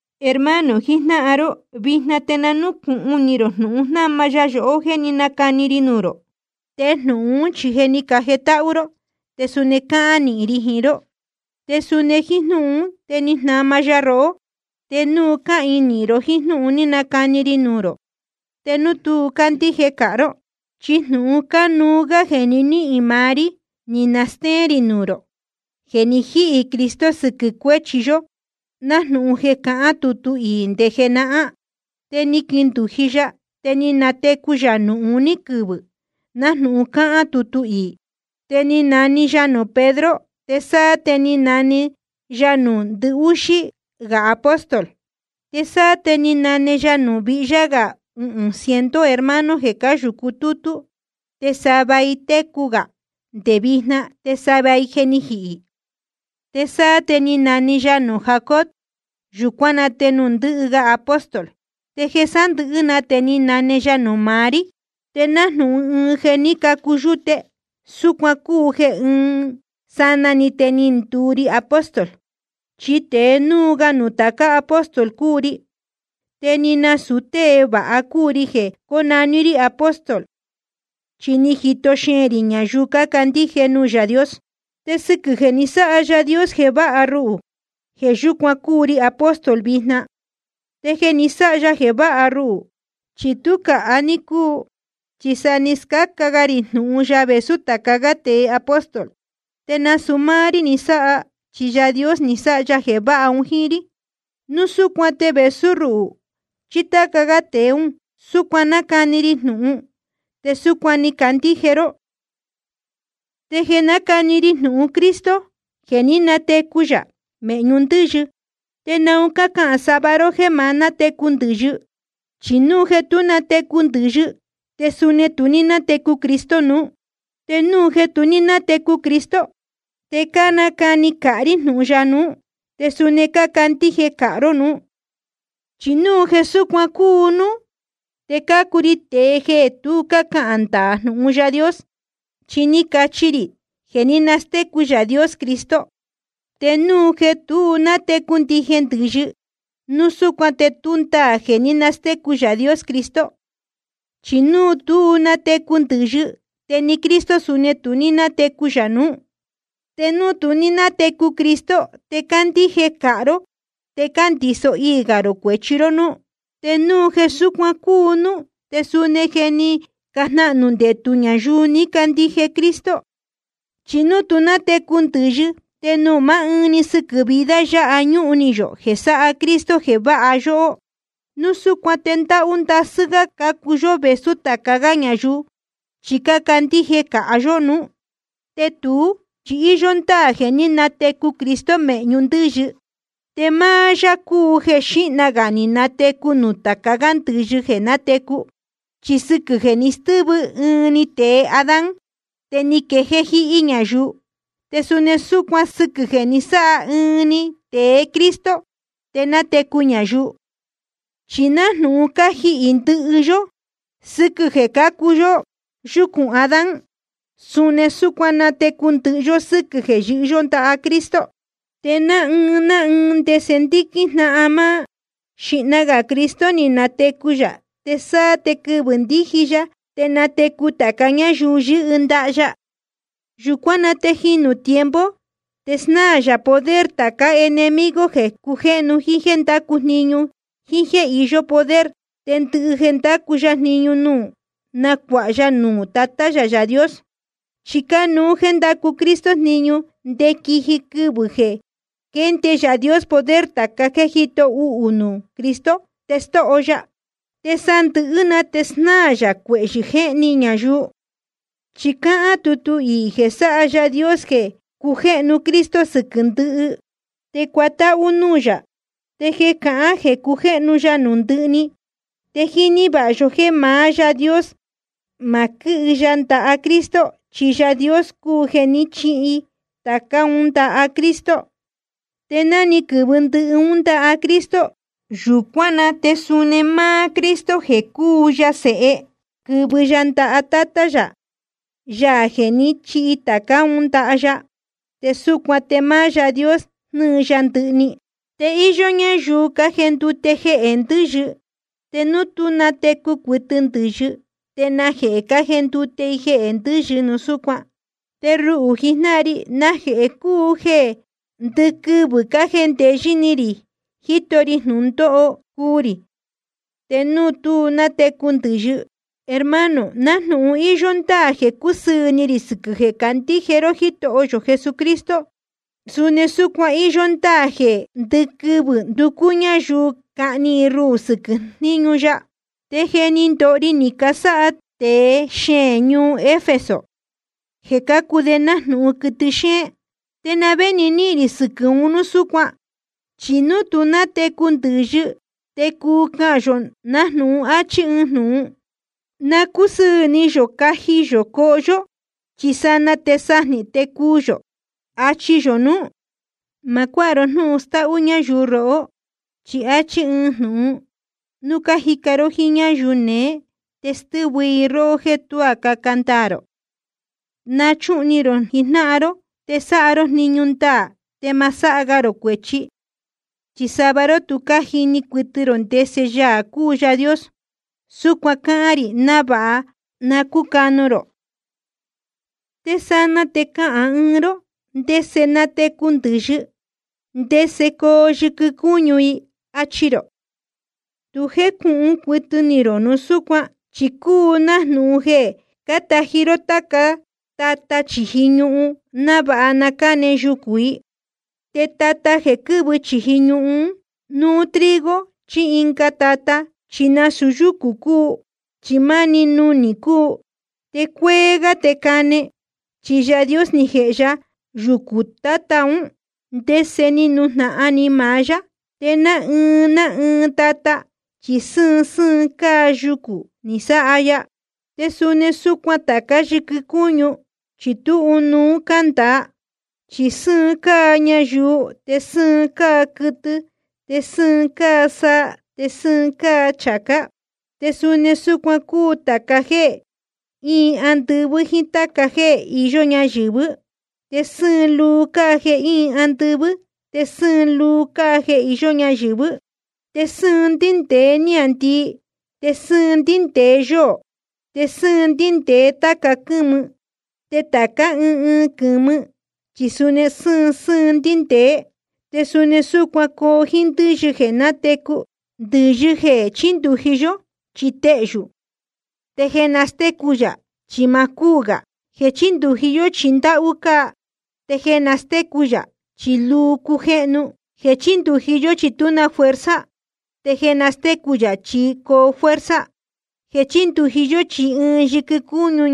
Hermano jijnáhan ró, vijna te nucūhun ni rō jnūhun jnáma ya yohó jeē ní nacani ri nuū rō. Te jnūhun ún chi je ni cajetáhú ró, te suni cáhīin nīhin ró jíín. Te suni jíín jnúhun ún te ni jnama ya rohó, te núu cáhīin nīhin ró jíín jnúhun ni nacani ri nuū rō, te núu tu ní cácandíje cāha ró. Chi jnūhun cánuú gá jeē ni níhīn maá rí ni nastéén rī nuū rō: Jeē ni jíhī Cristo sɨquɨ̄ cuéchi yó, nájnūhun je cáhán tutu iī nde jenahán. Te ni quindūji ya, te ni natecu yā nuū uní quɨvɨ̄, nájnūhun cáhán tutu iī. Te ni nane ya nuū Pedro. Te sáá te ni nane ya nuū ndɨhúxí gā apóstol. Te sáá te ni nane ya nuū vihyá gā uhūn ciento hermano jeē cáyūcu tútú. Te sava i técu gā nde vijna, te sava i je ni jihī. Te sáá te ni nane ya nuū Jacobo, yūcuán na te nuū ndɨhɨ ga apóstol. Te jeē sándɨ̄hɨ́ na te ni nane ya nuū maá rí. Te nájnūhun ɨɨn jeē ní cacu yúte, súcuan cúu jeē ɨɨn sanaa‑ni te ni nduu ri apóstol. Chi tēe núu ga nuū tāca gá apóstol cúu ri, te ni nasūu tée vāha cúu ri jeē cónaní rí apóstol, chi ni jito xeēn rī ñayuu cácandíje nuū Yaā Dios. Te sɨquɨ̄ jeē ni sáha Yaā Dios jeē váha ruhū, jeē yúcuan cúu ri apóstol vijna. Te jeē ni sáha ya jeē váha ruhū, chi tú cāha ní cúu, chi sa ni scáca ga rī jnūhun ya vēsú tāca gá tēe apóstol. Te nasūu máá rí ni sáha, chi Yaā Dios ni sáha ya jeē váha un jíín rí. Núu súcuan te vēsú ruhū chí táca gá tēe ún, súcuan cánacani ri jnūhun, te súcuan ni cacandíje ró. Te jeē cánacani ri jnūhun Cristo jeē ní natecu yā mēhñu ndɨ́yɨ, ¿te naun cácahān sava ró jéē ma nátecu ndɨ̄yɨ? Chi núu jeē tú natecu ndɨ̄yɨ, te suni tu ní nátecu Cristo nuú. Te núu jeē tu ní nátecu Cristo, te cánacani cāha rí jnūhun ya nuú, te suni cácandíje cāha ró núú. Chi núu jeē súcuan cúu núú, te cácuu ri tēe jeē tu cácahān ndaā jnūhun Yaā Dios, chi ni cacachi rī jeē ní nastécu Yaā Dios Cristo. Te núu jeē tú natecu ndije ndɨ̄yɨ, núu súcuan te tú ndaā jeē ní nastécu Yaā Dios Cristo. Chi núu tú natecu ndɨ̄yɨ, te ni Cristo suni tu ní nátecu yā nuú. Te núu tu ní nátecu Cristo, te cácandíje cāha ró te cándiso iī gā rō cuēchi ró núú. Te núu jeē súcuan cúu núú, te suni je ni cajnahnū ndetū ñayuu ni cacandíje Cristo. Chi núu tú natecu ndɨ̄yɨ, te núu máá ɨɨn‑ni sɨquɨ̄ vida yáha ñúhun ni yō jeē sáha Cristo jeē váha yóhó, núu súcuan te ndahú ndasɨ́ gá cácuu yó vēsú tāca gá ñayuu, chi cácandíje cāha yó nuú. Te tuú chi íyó ndáā jeē ní natecu Cristo mēhñu ndɨ́yɨ. Te máá yá cúu jeē xíhna gā ni natecu nuū tāca gá ndɨ̄yɨ jeē natecu. Chi sɨquɨ̄ jeē ni stɨ́vɨ ɨɨn‑ni tēe Adán, te ni quejéé jíhí ñayuu. Te suni súcuan sɨquɨ̄ jeē ni sáha ɨɨn‑ni tēe Cristo, te natecu ñayuu. Chi nájnūhun cájihī ndɨhɨ yó sɨ́quɨ̄ jeē cácuu yó yúcūn Adán, suni súcuan natecu ndɨhɨ yó sɨ́quɨ̄ jeē yɨ́hɨ yó ndaha Cristo. Te ná ɨɨn ná ɨɨn ndese ndíquín jnáhan máá: Xīhna gā Cristo ni natecu yā, te sáá te quɨvɨ̄ ndíji ya te natecu tāca ñáyuu yɨ́hɨ ndaha ya. Yūcuán na te jīnu tiempo, te snáā yā poder tācá enemigo jeē cujéhnu jíín jéē ndácu jniñu jíín jéē iyó poder. Te ndɨhɨ jeē ndácu ya jniñu nuū, nacuāha ya nuū Tatá yā Yaā Dios. Chi cánuú jéē ndacu Cristo jniñu nde quiji quɨvɨ̄ jeē quénde Yaā Dios poder tāca jéē jíto uhū nuū Cristo, te stóho ya. Te jeē sándɨ̄hɨ́ na te snáā yā cuehyɨ jéhni ñayuu. Chi cáhán tutu iī jeē sáha Yaā Dios jeē cujéhnu Cristo sɨquɨ̄ ndɨhɨ, te cuatáhú núū yā. Te jeē cahán jeē cujéhnu ya nuū ndɨhɨ‑ni, te jíní vāha yó jéē maá Yaā Dios ma quɨ́hɨ ya ndaha Cristo, chi Yaā Dios cúu jeē ni chíhi tācá un ndaha Cristo. Te ná ni quɨ̄vɨ ndɨhɨ ún ndaha Cristo, yūcuán na te suni máá Cristo jeē cúu ya Sēhe, quɨ̄vɨ ya ndaha Tátá yā, Yaā jeē ní chihi tācá un ndaha ya. Te súcuan te máá Yaā Dios jnɨɨ ya ndɨhɨ‑ni. Te íyó ñáyuu cájendute jehē ndɨ́yɨ. Te núu tú natecu cuɨtɨ ndɨ̄yɨ, ¿te najehē cájendute i jehē ndɨ́yɨ núu súcuan? Te ruhū jijnáhan ri, ¿najehē cúu jeē ndɨquɨvɨ̄ cájendeyɨ́ ni rī jíto ri jnūndóho cuu rī, te núu tú natecu ndɨ̄yɨ? Hermano, nájnūhun íyó ndáā jeē cúsɨɨ̄ ni rī sɨquɨ̄ jeē cácandíje ró Jítoho yō Jesucristo, suni súcuan íyó ndáā jeē ndɨquɨvɨ̄ nducú ñáyuu cahni ruhū sɨquɨ̄ jníñu ya. Te jeē ní ndoho ri ni casáha tēe xeēn ñuu Efeso, jeē cácuu de nájnūhun quɨtɨ xéén, ¿te na vé nihín rī sɨquɨ̄ un núu súcuan? Chi núu tú natecu ndɨ̄yɨ, te cuu cahān yō nájnūhun áchí ɨɨn jnūhun: Na cúsɨɨ̄ ni yō caji yō coho yó, chi sanaa te sajnē te cuu yō, achi yō nuú. Ma cuáha ró jnúhun stáhú ñáyuu rohó. Chi áchí ɨɨn jnūhun: Núu cájica ró jíín ñáyuu neé, te stɨ́vɨ i róhó jéē tuá caca ndaā rō. Nachuhun ni rō jijnáhan ró, te sáha ró jniñu ndaā, te ma sáha ga rō cuēchi. Chi sava ró tu cájini cuɨtɨ rō ndese Yaā cúu Yaā Dios. Súcuan cáhán rī návāha na cúcanu rō. Te sanaa te cahān ɨɨn ró: ¿Ndese natecu ndɨ̄yɨ? ¿Ndese coo yɨquɨ cúñu i? achi rō. Tu jécūhun cuɨtɨ ni rō núu súcuan. Chi cúu nájnūhun jeē cátají ró táca tata chīji ñuhun návāha nane yucū i. Te tata jeē quɨ́vɨ chīji ñuhun, núu trigo chí ɨnga tata, chi nasūu yúcū cúu, chi máá núnī‑ni cúu. Te cuéé gá te cane, chi Yaā Dios ni jēhe ya yucū tata ún, ndese ni nujnahan ni maá yá, te ná ɨɨn ná ɨɨn tata chi sɨ́ɨn sɨ́ɨn cáa yucū ni sáha ya. Te suni súcuan tācá yɨquɨ cúñu, chi tú ɨnuú cándāa. Chi sɨ́ɨn cáa ñayuu, te sɨ́ɨn cáa quɨtɨ, te sɨ́ɨn cáa saa, te sɨ́ɨn cáa chācá. Te suni súcuan cúu tāca jéē íin andɨvɨ́ jíín táca jéē iyó ñáyɨ̄vɨ́. Te sɨ́ɨn luu cáa jeē íin andɨvɨ́, te sɨ́ɨn luu cáa jeē iyó ñáyɨ̄vɨ́. Te sɨ́ɨn ndíndēe níāndii, te sɨ́ɨn ndíndēe yóō, te sɨ́ɨn ndíndēe táca quɨ́mɨ. Te tācá ɨɨn ɨɨn quɨ̄mɨ chi suni sɨ́ɨn sɨ́ɨn ndíndēé. Te suni súcuan coo jíín ndɨ́yɨ jeē natecu. Ndɨ̄yɨ jeē chíndūji yó chi téhyū, te jeē nastécu yā chi ma cúū gā. Jeē chíndūji yó chi ndáhú cáa, te jeē nastécu yā chi luu cujéhnu. Jeē chíndūji yó chi tú na fuerza, te jeē nastécu yā chi coo fuerza. Jeē chíndūji yó chi ɨɨn yɨquɨ cúñu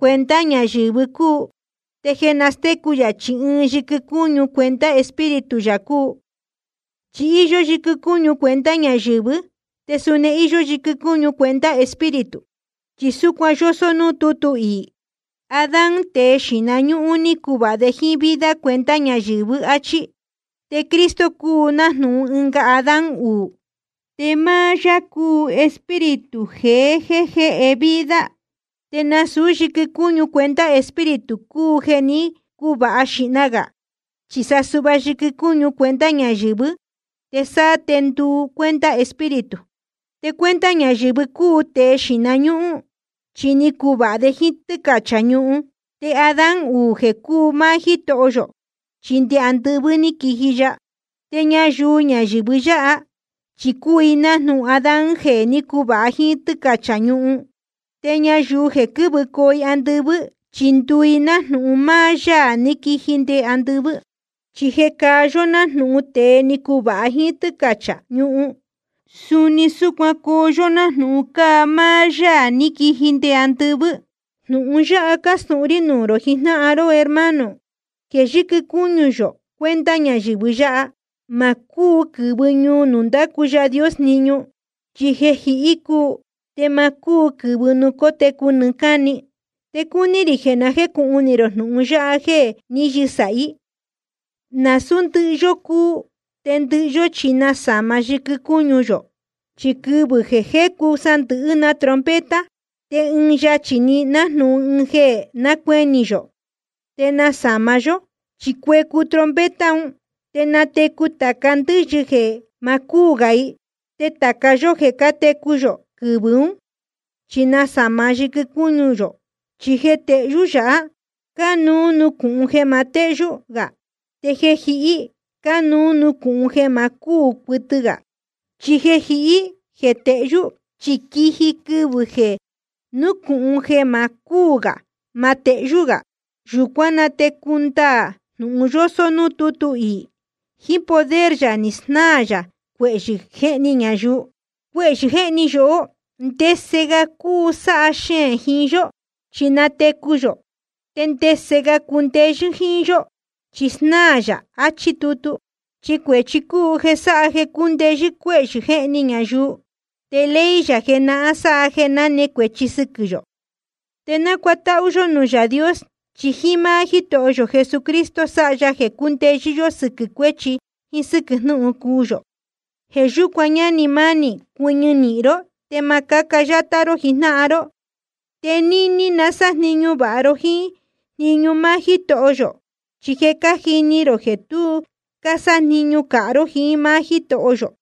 cuenta ñayɨ̄vɨ cúu, te jeē nastécu yā chi ɨɨn yɨquɨ cúñu cuenta Espíritu yā cúu. Chi íyó yɨquɨ cúñu cuenta ñayɨ̄vɨ́, te suni íyó yɨquɨ cúñu cuenta Espíritu. Chi súcuan yósó núū tútu iī: Adán, tēe xīhna ñúhún, ni cuvāha de jíín vida cuenta ñayɨ̄vɨ́, áchí. Te Cristo cúu nájnūhun ɨnga Adán uū, te máá yá cúu Espíritu jeē jéhe vida. Te nasūú yɨquɨ cúñu cuenta Espíritu cúu jeē ní cuvāha xīhna gā, chi sa suhva yɨquɨ cúñu cuenta ñayɨ̄vɨ́, te sáá te nduu cuenta Espíritu. Te cuenta ñayɨ̄vɨ cúu tēe xīhna ñúhún, chi ni cuvāha de jíín tɨ́cachā ñuhun. Te Adán uū jeē cúu máá Jítoho yō, chi nde andɨvɨ́ ní quiji ya. Te ñayuu ñayɨ̄vɨ yáha, chi cúu i jnáhan Adán jeē ní cuvāha jíín tɨ́cachā ñuhun. Te ñayuu jeē quɨ́vɨcoo andɨvɨ́, chi ndúu i nájnūhun máá Yaā ní quiji nde andɨvɨ́. Chi jeē cáa yó nájnūhun tēe ni cuvāha jíín tɨ́cachā ñuhun, suni súcuan coo yó nájnūhun cáa máá Yaā ní quiji nde andɨvɨ́. Jnūhun yáha cástūhun rí nuū rō jijnáhan ró, hermano, jeē yɨquɨ cúñu yō cuenta ñayɨ̄vɨ yáha, ma cúu quɨ̄vɨ ñuu nuū ndácu Yaā Dios jniñu. Chi jeē jihí cúu, te ma cúu quɨ̄vɨ nuū cótecu nɨɨ́ cáni. Te cúní rī jeē na jécūhun ni rō jnūhun yáha jeē ní yɨsāhí: Nasūú ndɨhɨ yó cuu, te ndɨhɨ yó chi nasāma yɨquɨ cúñu yō. Chi quɨvɨ̄ jeē cuécu sandɨ̄hɨ́ na trompeta, te ɨɨn yachī‑ni, nájnūhun ɨɨn jeē nácuenī‑ni yó, te nasama ya yohó. Chi cuecu trompeta un, te natecu tāca ndɨ́yɨ jeē ma cúū gā i. Te tāca yó jeē cátecu yō quɨvɨ̄ ún, chi nasama ya yɨquɨ cúñu yō. Chi jeē tehyú yāhá, cánuú nucūhun jeē ma téhyú gā. Te jeē jihí cánuú nucūhun jeē ma cúū cuɨtɨ gā. Chi jeē jihí jeē tehyú, chi quiji quɨvɨ̄ jeē nucūhun jeē ma cúū gā ma tehyú gā. Yūcuán na te cundaā jnūhun yósó núū tútu iī: Jíín poder yā ni snáā yā cuehyɨ̄ jéhni ñayuu. Cuehyɨ̄ jéhni yóhó ¿ndese ga cuu sáha xeēn jiín yó? Chi natecu yō. ¿Te ndese ga cundeyɨ́ jíín yó? Chi snáā yā. Achí tutu. Chi cuēchi cúu jeē sáha jeē cúndeyɨ́ cuehyɨ̄ jéhni ñayuu. Te ley yā jenahán sáha jeē náne cuēchi sɨquɨ̄ yō. Te na cútahū yō nuū Yaā Dios, chi jíín máá Jítoho yō Jesucristo sáha ya jeē cúndeyɨ́ yó sɨquɨ̄ cuéchi jíín sɨ́quɨ̄ jnūhun cuu yō. Jeē yúcuan, ñánī mánī, cuɨñɨ nīhin ró te ma cáca yátá ró jijnáhan ró. Te níní na sájniñu vāha ró jíín jniñu máá Jítoho yō. Chi je cájini rō jeē tu cásájniñu cāha ró jiín máá Jítoho yō.